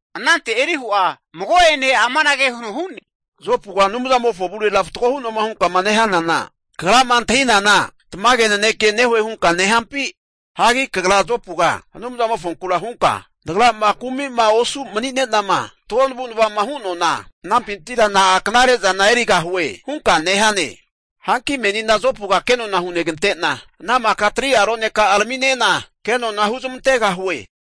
Anante Elihu'a mago'ene amanage huno hu'ne, Jopuga Anumzamofo avurera fatgo hu'noema hunkama nehanana, kagrama antahinana tamage naneke nehue hunka nehampi? Hagi kagra Jopuga Anumzamofonku hunka, nagrama kumi'ma osu mani'ne'nama fatgo navu'nava'ma hanuana, anampintira na'a knare'zana erigahue? hunka nehane. Hanki menina Jopuga kenona hunegante'na ana maka 3'a roneka'a raminena, kenona huzamantegahue.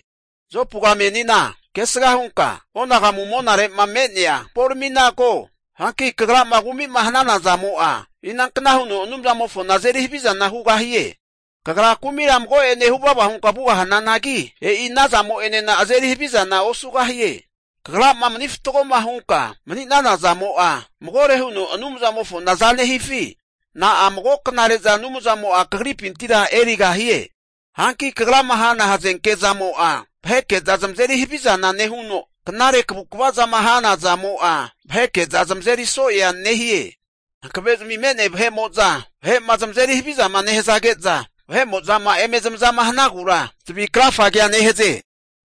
Jopuga menina kesga hunka onagamu monare'ma me'nea hamporamina ko. Hanki kagrama kumi'ma hanana zamo'a inankna huno Anumzamofona azeri havizana hugahie? Kagra kumira mago'ene huvava hunka vugahananagi, e'i ana zamo'enena azeri havizana osugahie. Kagrama mani fatgoma hunka manina zamo'a, magore huno Anumzamofona aza nehifi? Na'a mago knare'za Anumzamo'a kagripintira erigahie? Hanki kagrama hana hazenke zamo'a, vaheke'za zamazeri havizana nehuno, knare kavukva'zama hana zamo'a vaheke'za zamazeri so'ea nehie. Hankave'zami me'nea vahe'mo'zama vahe'ma zamazeri havizama nehazage'za, mago'a vahe'mo'zama eme zamazama hanagura zavi krafage nehaze.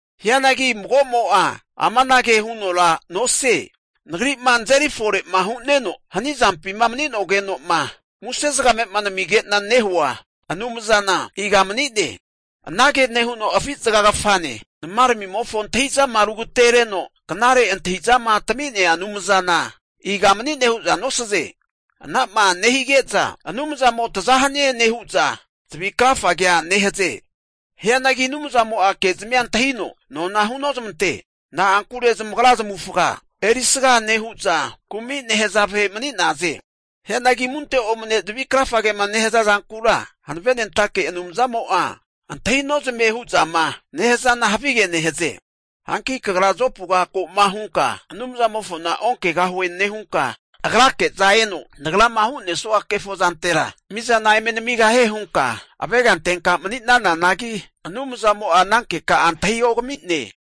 Hianagi mago'mo'a amanage hunora nosie, nagri'ma nazeri fore'ma hu'neno, hani zampima mani'nogeno'ma muse zagame'ma namige'nama nehua Anumzana iga manie? Anage nehuno afi zaga kafane, nama ramimofo antahi'zama rugatereno knare antahi'zama tami'nea Anumzana iga mani'ne hu'za nosaze? Ana'ma nehige'za Anumzamo taza hanie nehu'za zavi krafagea nehaze. Hianagi Anumzamo'a ke'zamia antahino nona hunozmante. Na'ankure zamagra zamavufaga erisga nehu'za, kumi nehaza vahe mani'naze. Hianagi zamunte omane vahe'mo'zama zavi krafagema nehaza zankura Hankavenentake Anumzamo'a antahi nozamie hu'zama nehazana havige nehaze. Hanki kagra Jopuga ko'ma hunka, Anumzamofona onkegahue nehunka, Agrake'za eno nagrama hu'nesua kefo zantera mizana eme namigahie hunka avega antenka mani'nananagi, Anumzamo'a ana keka'a antahiogami'ne.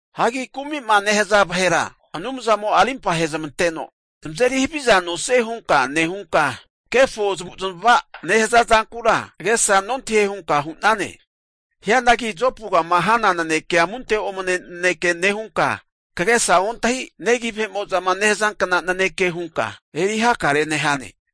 Hagi kumi'ma nehaza vahera Anumzamo'a arimpa ahezamanteno zamazeri haviza nosie hunka nehunka, kefo zamavu zamava'ma nehaza zankura agesa nontahie hunka hu'nane. Hianagi Jopugama hana nanekea amunte omane naneke nehunka, kagesa ontahi negi vahe'mo'zama nehazankna naneke hunka eri hakare nehane.